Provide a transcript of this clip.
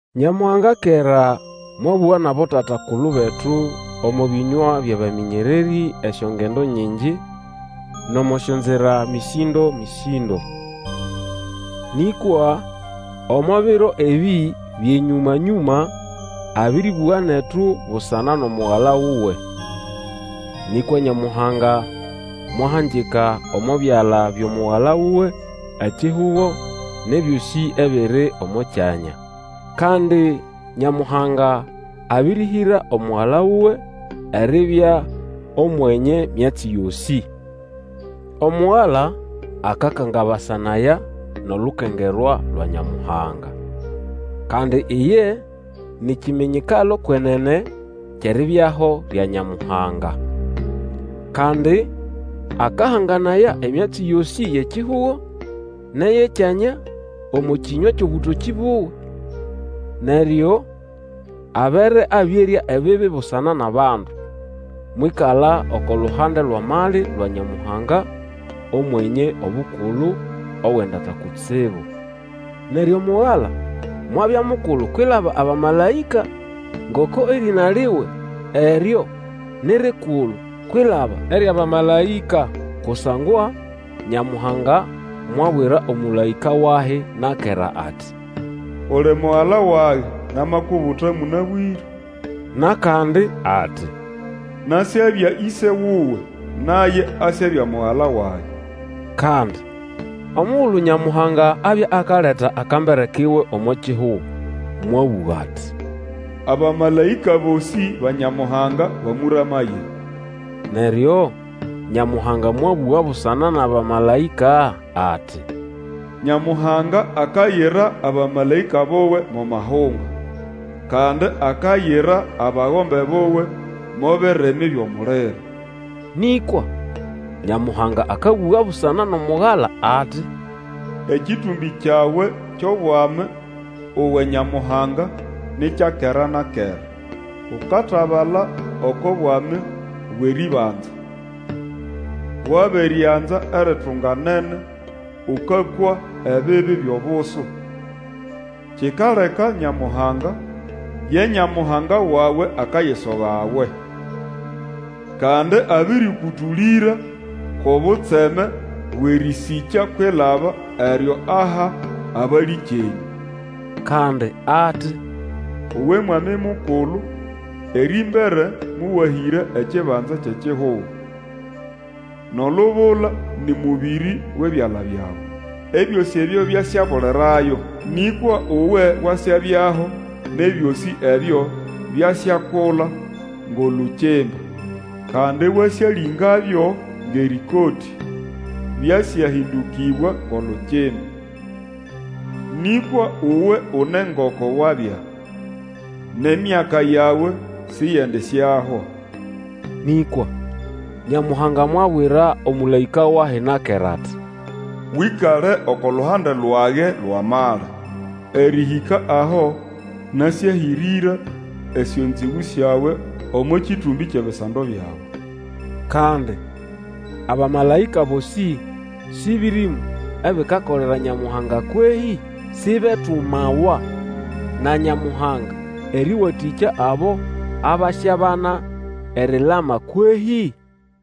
Nyamuhanga kera mwabũga nʼabotata-kulu betu omo bĩnywa byʼabamĩnyererĩ, esyongendo nyingi nʼomo syonzira mĩsĩndo-mĩsĩndo. Nĩkwa omo biro ebĩ byʼenyũma-nyũma abĩrĩbũga netu busana nʼomugala wuwe. Nĩkwa Nyamuhanga mwahangika omo byala byʼomugala wuwe ekihugo nʼebyosĩ ebiri omo kyanya. Kandi Nyamuhanga abĩrĩhĩra Omugala wuwe eribya Omwenye myatsi yosĩ. Omugala akakangabasanaya nʼolukengerwa lwa Nyamuhanga. Kandi iye ni kiminyikalo kwenene kyʼeribyaho lya Nyamuhanga. Kandi akahanganaya emyatsi yosĩ yʼekihugo nʼeyʼekyanya omo kĩnywa kyʼobũtokĩ buwe. Neryo abere abĩerya ebibi busana nʼabandu, mwĩkala oko luhande lwʼamali lwa Nyamuhanga Omwenye Obukulu Owendata kutsibu. Neryo Mugala mwabya mukulu kwilaba abamalaĩka, ngoko erĩna liwe eryo ni rikulu kwilaba eryʼabamalaĩka. Kusangwa Nyamuhanga mwabwira omũlaĩka wahi na kera ati, Uli Mugala wage, Namakubuta mũnabwĩre. Nʼakandi ati, Nasyabya Ĩse wuwe, Naye asyabya Mugala wage. Kandi omugulu Nyamuhanga abya akaleta akambere kuwe omo kihugo, mwabũga ati, Abamalaĩka bosĩ ba Nyamuhanga bamũramaye. Neryo Nyamuhanga mwabũga busana nʼabamalaĩka ati, Nyamuhanga akayira abamalaĩka buwe mo mahunga, Kandi akayira abagombe buwe mo birimi byʼomuliro. Nĩkwa Nyamuhanga akabũga busana nʼomugala ati, Ekĩtũmbĩ kyawe kyʼobwami, uwe Nyamuhanga, ni kya kera na kera, Ukatabala oko bwami bwʼerĩbanza. Wabirianza eritunganene, ũkakwa ebibi byʼobusu; Kikaleka Nyamuhanga, ye Nyamuhanga wawe akayisoga we. Kandi abĩrĩkũtũlĩra kwʼobutseme bwʼerĩsĩkya kwilaba eryo aha abalĩkyenyũ. Kandi ati, Uwe Mwami Mukulu, erĩmbere mowahĩra ekibanza kyʼekihugo. Nʼolubula nĩ mũbĩrĩ wʼebyala byawe. Ebyosĩ ebyo byasyabulirayo, nĩkwa Uwe wasyabyaho Nʼebyosĩ ebyo byasyakula ngʼolukimba, Kandi wasyalĩngabyo ngʼerĩkotĩ, Byasyahĩndũkĩbwa ngʼolukimba. Nĩkwa uwe une ngoko wabya. Nʼemyaka yawe siyendisyahwa. Nĩkwa Nyamuhanga mwabwira omũlaĩka wahi na kera ati, Wĩkale oko luhande lwage lwʼamali, Erĩhĩka aho nasyahĩrĩra esyonzĩgũ syawe Omo kĩtũmbĩ kyʼebisando byawe. Kandi abamalaĩka bosĩ sĩ bĩrĩmũ ebikakolera Nyamuhanga kwehĩ? Sibetumawa na Nyamuhanga erĩwatĩkya abo abasyabana erilama kwehĩ?